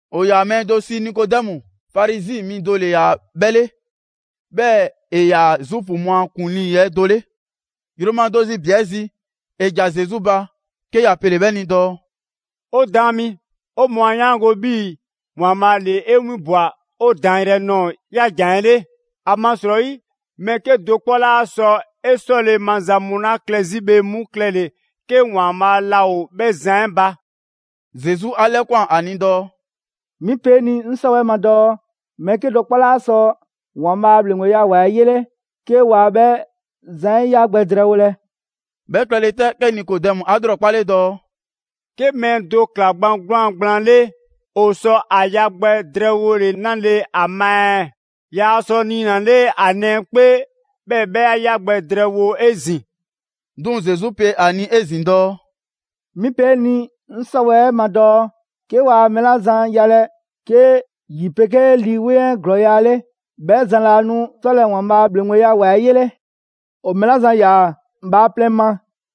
‑O ‑yaa mɛɛ do sii Nikodɛmu. Farizi mi do ‑le ‑yaa 'bhɛ 'le. 'Bhɛɛ‑ ‑e ‑yaa Zuufu mu a ‑kuŋlii 'ɛ do 'le. Yroma do zi ‑bi 'ɛ zi, ‑e ‑ja Zesu ba, 'ke ‑ya pele‑ 'bhɛ ni dɔɔ: «'O Daan mi, 'o mɔɔ 'a 'yaango‑ 'bhii‑ ‑Waanbhaa' ‑le 'e 'winbwa‑ 'o daanyrɛ nɔɔ‑ ‑yaa' ‑jan 'ɛ 'le. ‑Amasrɔyi mɛɛ 'kedo‑ 'kpɔ 'laa sɔ 'e 'sɔle‑ maza mu 'la klɛ 'zi bhe 'mu klɛle‑, 'ke ‑Waanbhaa' laa ‑o 'bhɛ zan 'ɛ ba.» Zesu 'a 'lɛkwan‑ ‑a ni dɔɔ: «'Mi pe 'e ni 'ŋ 'sɔwɛɛ‑ ma dɔɔ mɛɛ 'kedo‑ 'kpɔ 'laa sɔ ‑Waanbhaa' a ‑bhleŋgbeya ‑wa 'ɛ 'yele 'ke waa 'bhɛ zan 'ɛ ya gbɛ drɛɛwolɛ.» 'Bhɛ klɛle 'tɛ, 'ke Nikodɛmu 'a 'lrɔkpale dɔɔ: «'Ke mɛɛ do ‑kla gban 'gwlaan‑ gblaan 'le, ‑o sɔ ‑a ya gbɛ drɛɛwole 'nale‑ ‑a ma ɛɛ? Yaa sɔ niinale ‑a nɛɛ 'kpee, 'bhɛɛ‑ 'bhɛ 'a 'ya gbɛ drɛɛwo 'ezin‑.» 'Duŋ‑ Zesu pe ‑a ni 'ezin‑ dɔɔ: «'Mi pe 'e ni 'ŋ 'sɔwɛɛ‑ ma dɔɔ 'ke waa mɛɛ 'la zan yalɛ 'ke ‑yi 'pegee Lii 'Weŋ 'ɛ ‑glɔɔya' 'le, 'bhɛ zan laa nu 'sɔlɛ‑ ‑Waanbhaa' 'a ‑bhleŋgbeya ‑wa 'ɛ 'yele. ‑O mɛɛ 'la zan ‑yaa bhaaplɛŋ ma,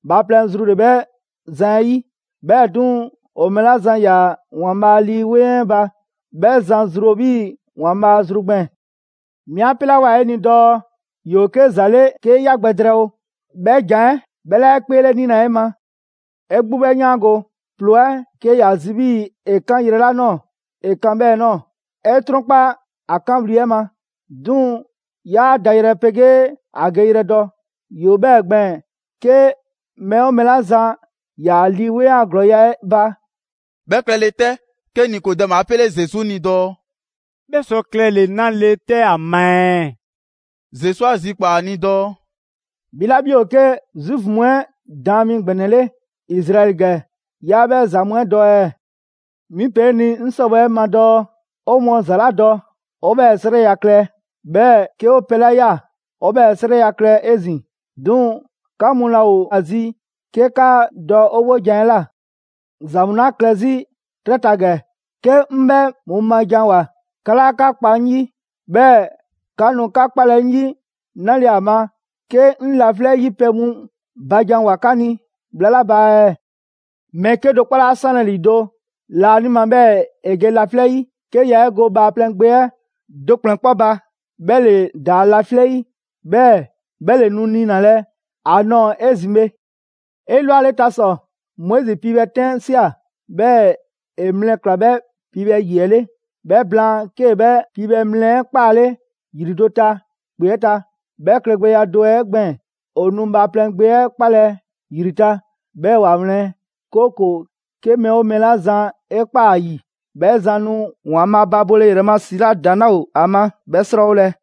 bhaaplɛŋ zru ‑le 'bhɛ zan 'ɛ 'yi, 'bhɛɛ‑ 'duŋ‑, ‑o mɛɛ 'la zan ‑yaa ‑Waanbhaa' Lii 'Weŋ 'ɛ ba, 'bhɛ zan zru ‑o 'bhii‑ ‑Waanbhaa' zru gbɛɛn‑. 'Mi 'a 'pelawoa 'e ni dɔɔ: ‹‑Yoo 'ke ‑za 'le 'kee 'ya gbɛ drɛɛwo›. 'Bhɛ ‑jan 'ɛ 'bhɛ 'laa 'e 'kpeelɛnilɛ 'e ma. 'E 'gbu 'bhɛ 'yaango‑, ‑ploo 'ɛ, 'ke ‑ya zi 'bhii‑ ‑e 'kan yrɛ 'la ꞊nɔɔ, ‑e kan 'bhɛɛ‑ ꞊nɔɔ. 'E 'trɔnkpa‑ ‑a 'kanwli‑ 'ɛ ma, 'duŋ‑ 'yaa dayrɛ 'pegee ‑a geyrɛ dɔ. ‑Yoo 'bhɛɛ‑ gbɛɛn‑, 'ke mɛɛ 'oo mɛɛ 'la zan ‑yaa Lii 'Weŋ a ‑glɔɔya' 'ɛ ba.» 'Bhɛ klɛle 'tɛ, 'ke Nikodɛmu 'a 'pele Zesu ni dɔɔ: «'Bhɛ sɔ klɛle‑ 'nale‑ 'tɛ ‑a ma ɛɛ?» Zesu 'a zikpaa‑ ‑a ni dɔɔ: «'Bhi 'la 'bhi ‑o 'ke Zuufu mu 'ɛ daan mi ‑gbɛnɛ 'le Izraɛli ‑gɛ, 'yaa 'bhɛ ‑za mu 'ɛ dɔ ɛɛ? 'Mi pe 'e ni 'ŋ 'sɔwɛɛ‑ ma dɔɔ 'o mɔɔ ‑za 'la dɔ, 'o 'bhɛɛ‑ 'srɛya‑ klɛ, 'bhɛɛ‑ 'ke 'o pɛ 'la ꞊ya, 'o 'bhɛɛ‑ 'srɛya‑ klɛ 'ezin‑, 'duŋ‑ 'ka mu laa ‑o ‑a zi 'ke 'ka dɔ 'o 'wojan‑ 'ɛ ꞊la. ‑Za mu 'la klɛ 'zi 'trɛ ta ‑gɛ, 'ke 'ŋ 'bhɛ mu ma ‑janwoa, 'ka 'laa 'ka kpa 'ŋ 'yi, 'bhɛɛ‑ 'ka nu 'ka 'kpalɛ‑ 'ŋ 'yi 'nale‑ ‑a ma, 'ke 'ŋ laflɛ' 'yi pɛ mu ba ‑janwoa 'ka ni bhla 'la ba ɛɛ? Mɛɛ 'kedo‑ 'kpɔ 'laa 'sanlɛ‑ ‑lido' laanima 'bhɛɛ‑ ‑e ge laflɛ' yi, 'ke yaa 'e go Bhaaplɛŋ Gbe 'ɛ do ‑kplɛn 'kpɔ ba, 'bhɛ ‑le ‑daa laflɛ' 'yi, 'bhɛɛ‑ 'bhɛ ‑le nu niinalɛ a nɔɔ‑ 'ezin‑ bhe.» «'Elwaleta ‑sɔ, Moizi piibhɛ 'tɛn ꞊sia, 'bhɛɛ‑ ‑e mlɛ ꞊kla 'bhɛ piibhɛ ‑yi 'ɛ 'le. 'Bhɛ blaan 'kee‑ 'bhɛ piibhɛ mlɛ 'ɛ 'kpale ‑yri do ta ‑kpe 'ɛ ta. 'Bhɛ klɛgbɛya do 'ɛ gbɛɛn‑, ‑o nu Bhaaplɛŋ Gbe 'ɛ 'kpalɛ‑ ‑yri ta, 'bhɛɛ‑ ‑wa wlɛn, 'kooko‑ 'ke mɛɛ 'oo mɛɛ 'la zan 'e ꞊kpaa ‑a ‑yi, 'bhɛ zan nu ‑Waanbhaa' ba bole ‑yrɛ ma ‑si 'la ‑daŋ' 'laa ‑o ‑a ma 'bhɛ 'srɔɔwolɛ.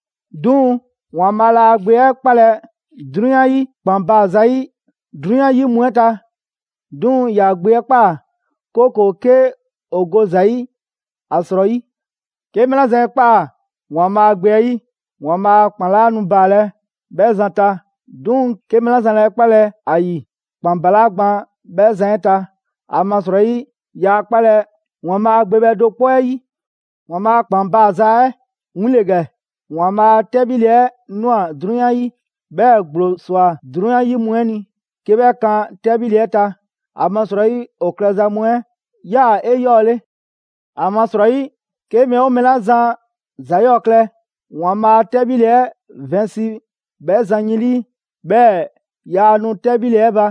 'Duŋ‑, ‑Waanbhaa' laa ‑a Gbe 'ɛ 'kpalɛ‑ 'drunyan 'yi ‑kpan baa‑ zayi' 'drunyan 'yi mu 'ɛ ta. 'Duŋ‑ ‑ya gbe 'ɛ ꞊kpaa, 'kooko‑ 'ke ‑o go ‑za 'yi ‑a 'srɔyi. 'Ke mɛɛ 'la zan 'e ꞊kpaa ‑Waanbhaa' Gbe 'ɛ 'yi, ‑Waanbhaa' a ‑kpan 'laa nu baalɛ 'bhɛ zan ta, 'duŋ‑ 'ke mɛɛ 'la zan 'laa 'e 'kpalɛ‑ ‑a ‑yi, ‑kpan ‑balaa' gban 'bhɛ zan 'ɛ ta, ‑amasrɔyi yaa 'kpalɛ‑ ‑Waanbhaa' Gbe bhɛ do 'kpɔ 'ɛ 'yi. ‑Waanbhaa' a ‑kpan baaza 'ɛ win ‑le ‑gɛ: ‑Waanbhaa' a 'tɛbhile 'ɛ ꞊nwa 'drunyan 'yi, 'bhɛɛ‑ ‑gblo ꞊swa 'drunyan 'yi mu 'ɛ ni 'ke 'bhɛ kan 'tɛbhile 'ɛ ta, ‑amasrɔyi ‑o klɛza mu 'ɛ 'yaa‑ 'eyɔɔle. ‑Amasrɔyi, 'ke mɛɛ 'oo mɛɛ 'la zan ‑za 'yɔɔ klɛ, ‑Waanbhaa' a 'tɛbhile 'ɛ vɛnsi 'bhɛ zan yin 'lii, 'bhɛɛ‑ yaa nu 'tɛbhile 'ɛ ba.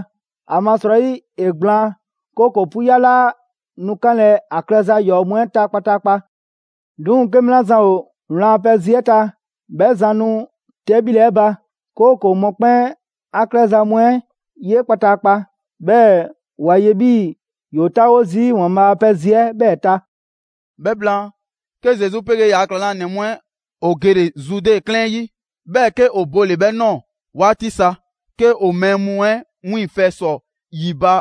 ‑Amasrɔyi ‑e gblaan, 'kooko‑ 'puya 'laa nu 'kanlɛ‑ ‑a klɛza ‑yɔɔ' mu 'ɛ ta kpataakpa. 'Duŋ‑ 'ke mɛɛ 'la zan ‑o wlan a pɛ zi 'ɛ ta, 'bhɛ zan nu 'tɛbhile 'ɛ ba; 'kooko‑ mɔkpɛn' 'a klɛza mu 'ɛ ye kpataakpa, 'bhɛɛ‑ ‑wa ye 'bhii‑ ‑yoo 'taawo zii' ‑Waanbhaa' a pɛ zi 'ɛ 'bhɛɛ‑ ta.» 'Bhɛ blaan, 'ke Zesu 'pegee ‑yaa' ‑klaŋlanɛ mu 'ɛ ‑o gele‑ Zude 'klɛɛn 'ɛ 'yi, 'bhɛɛ‑ 'ke ‑o bole‑ 'bhɛ ꞊nɔɔ 'waati sa, 'ke ‑o mɛɛ mu 'ɛ 'wiiŋfɛ‑ ‑sɔ ‑yi ba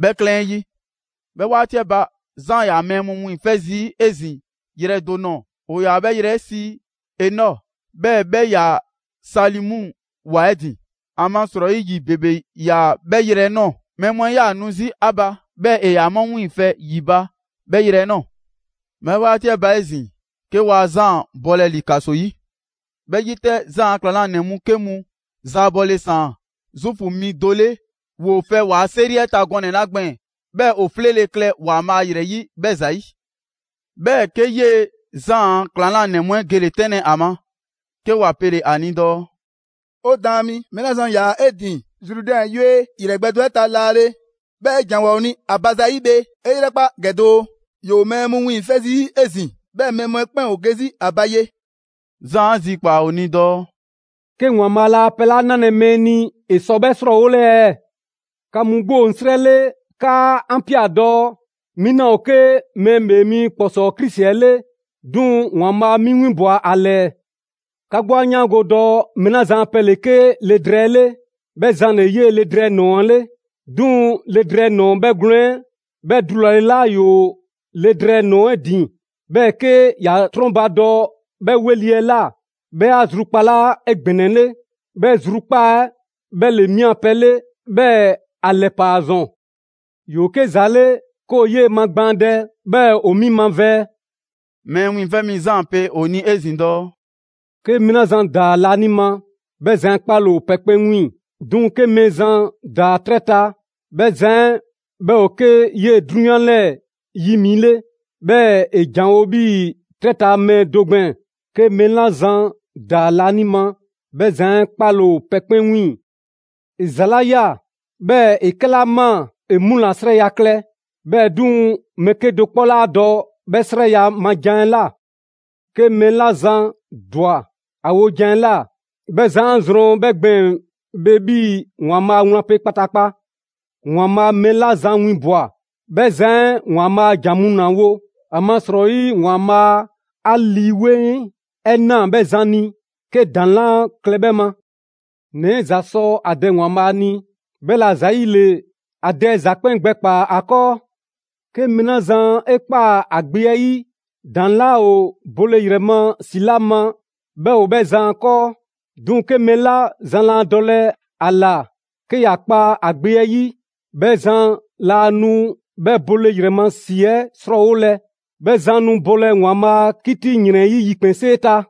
'bhɛ 'klɛɛn 'ɛ 'yi. 'Bhɛ 'waati 'ɛ ba, Zaan ‑yaa mɛɛ mu wiiŋfɛ' zii' 'ezin‑ yrɛ do nɔɔ‑, ‑o ‑yaa 'bhɛ yrɛ 'ɛ sii Enɔ, 'bhɛɛ‑ 'bhɛ 'yaa‑ Salimu ‑wa 'ɛ ‑din. ‑Amasrɔyi ‑yi ‑bebe ‑yaa 'bhɛ yrɛ 'ɛ ꞊nɔɔ. Mɛɛ mu 'ɛ 'yaa‑ nu 'zi ‑a ba, 'bhɛɛ‑ ‑e ‑yaa 'mu wiiŋfɛ ‑yi ba 'bhɛ yrɛ 'ɛ ꞊nɔɔ. 'Bhɛ 'waati 'ɛ ba 'ezin‑, 'ke waa Zaan bɔlɛ ‑li ‑kaso 'yi. 'Bhɛ 'yi 'tɛ, Zaan a ‑klaŋlanɛ mu 'ke mu zaabɔle ‑saan Zuufu mi do 'le ‑woo fɛ ‑waa' 'seri 'ɛ ta gɔnɛ‑ 'la gbɛɛn‑ 'bhɛɛ‑ ‑o 'fleele‑ klɛ ‑Waanbhaa' ‑yrɛ 'yi 'bhɛ ‑zayi'. 'Bhɛɛ‑, 'ke 'yee‑ Zaan a ‑klaŋlanɛ mu 'ɛ gele‑ 'tɛnlɛ‑ a ma, 'ke ‑wa pele‑ ‑a ni dɔɔ: «'O Daan mi, mɛɛ 'la zan ‑yaa 'e ‑din Zrudɛn yue yrɛ gbɛ do 'ɛ ta laale, 'bhɛɛ‑ 'e ‑janwoa 'o ni ‑a ba zayi' bhe; 'e 'yrɛkpa ‑gɛ doo, ‑yoo mɛɛ mu wiiŋfɛ' zii' 'ezin‑. 'Bhɛɛ‑ mɛɛ mu 'ɛ 'kpɛn ‑o ge 'zi ‑a ba ye.» Zaan 'a zikpaa‑ ‑o ni dɔɔ: «'Ke ‑Waanbhaa' laa pɛ 'la 'nalɛ‑ mɛɛ ni, ‑e sɔ 'bhɛ 'srɔɔwole ɛɛ? 'Ka mu 'gbu ‑o 'ŋ 'srɛ 'le 'kaa 'an ꞊pia dɔɔ: ‹'Mi 'naa ‑o 'ke Mɛɛ ‑Bhee Mi ‑Kpɔsɔɔ Krisi 'ɛ 'le, 'duŋ‑ ‑Waanbhaa' 'mi 'winbwa‑ ‑a ‑lɛɛ.› 'Ka 'gbu 'a 'yaango‑ dɔɔ mɛɛ 'la zan a pɛ ‑le 'ke le drɛɛ 'ɛ 'le, 'bhɛ zan ‑le 'yee‑ le drɛɛ ‑nɔɔ 'ɛ 'le. 'Duŋ‑ le drɛɛ ‑nɔɔ 'bhɛgwlɛn‑ 'ɛ 'bhɛ dulale 'la ‑yoo le drɛɛ ‑nɔɔ 'ɛ ‑din, 'bhɛɛ‑ 'ke ‑ya 'trɔnbadɔ 'bhɛ 'weli‑ 'ɛ ꞊la, 'bhɛ 'a zrukpalaa 'egbɛnɛle. 'Bhɛ zrukpaa', 'bhɛ ‑le 'mi a pɛ 'ɛ 'le, 'bhɛɛ‑ ‑a ‑lɛpaa ‑zɔn. ‑Yoo 'ke ‑za 'le 'ke ‑o 'yee‑ magbaandɛ, 'bhɛɛ‑ ‑o 'mi mavɛɛ.» Mɛɛ Wiiŋfɛ' Mi Zaan pe ‑o ni 'ezin‑ dɔɔ: «'Ke mɛɛ 'la zan ‑daa laanima, 'bhɛ zan 'ɛ 'kpaale‑ ‑o pɛ 'kpɛn 'wiiŋ‑. 'Duŋ‑ 'ke mɛɛ zan ‑daa 'trɛ ta, 'bhɛ zan 'ɛ 'bhɛ ‑o 'ke 'yee‑ 'drunyan 'lɛɛ‑ 'yi mi 'le, 'bhɛɛ‑ ‑e ‑janwo' 'bhii‑ 'trɛ ta mɛɛ do gbɛɛn‑. 'Ke mɛɛ 'la zan ‑daa laanima, 'bhɛ zan 'ɛ 'kpaale‑ ‑o pɛ 'kpɛn 'wiiŋ‑. ‑E ‑za 'la ꞊ya, 'bhɛɛ‑ ‑e 'kɛla ꞊maa, ‑e mu ‑la 'srɛya‑ klɛ. 'Bhɛɛ‑ 'duŋ‑, mɛɛ 'kedo‑ 'kpɔ 'laa dɔ 'bhɛ 'srɛya‑ ma jan 'ɛ ꞊la. 'Ke mɛɛ 'la zan ‑dwa ‑a wojan 'ɛ ꞊la, 'bhɛ zan 'a zrɔn 'bhɛ gbɛɛn‑ bhe 'bhii‑ ‑Waanbhaa' wlan pe kpataakpa. ‑Waanbhaa' mɛɛ 'la zan winbwa‑, 'bhɛ zan 'ɛ ‑Waanbhaa' a ‑jan mu ‑la wo, ‑amasrɔyi ‑Waanbhaa' 'a Lii 'Weŋ 'ɛ na 'bhɛ zan ni 'ke ‑daŋ' 'laa klɛ 'bhɛ ma. ‑Nɛ 'ɛ ‑za sɔ ‑a Dɛ ‑Waanbhaa' ni, 'bhɛla‑ ‑zayile ‑a Dɛ ‑za 'kpɛn gbɛkpaa‑ ‑a 'kɔɔ. 'Ke mɛɛ 'la zan 'e ꞊kpaa ‑a Gbe 'ɛ 'yi, ‑daŋ' 'laa ‑o bole ‑yrɛ ma ‑si 'la ma 'bhɛ ‑o 'bhɛ zan 'kɔɔ. 'Duŋ‑ 'ke mɛɛ 'la zan laa dɔlɛ ‑a ‑la 'ke ‑ya kpa ‑a Gbe 'ɛ 'yi, 'bhɛ zan laa nu 'bhɛ bole ‑yrɛ ma ‑si 'ɛ 'srɔɔwolɛ, 'bhɛ zan nu bolɛ ‑Waanbhaa' a 'kiti ‑yrɛn 'ɛ 'yi yikpɛnsee ta.»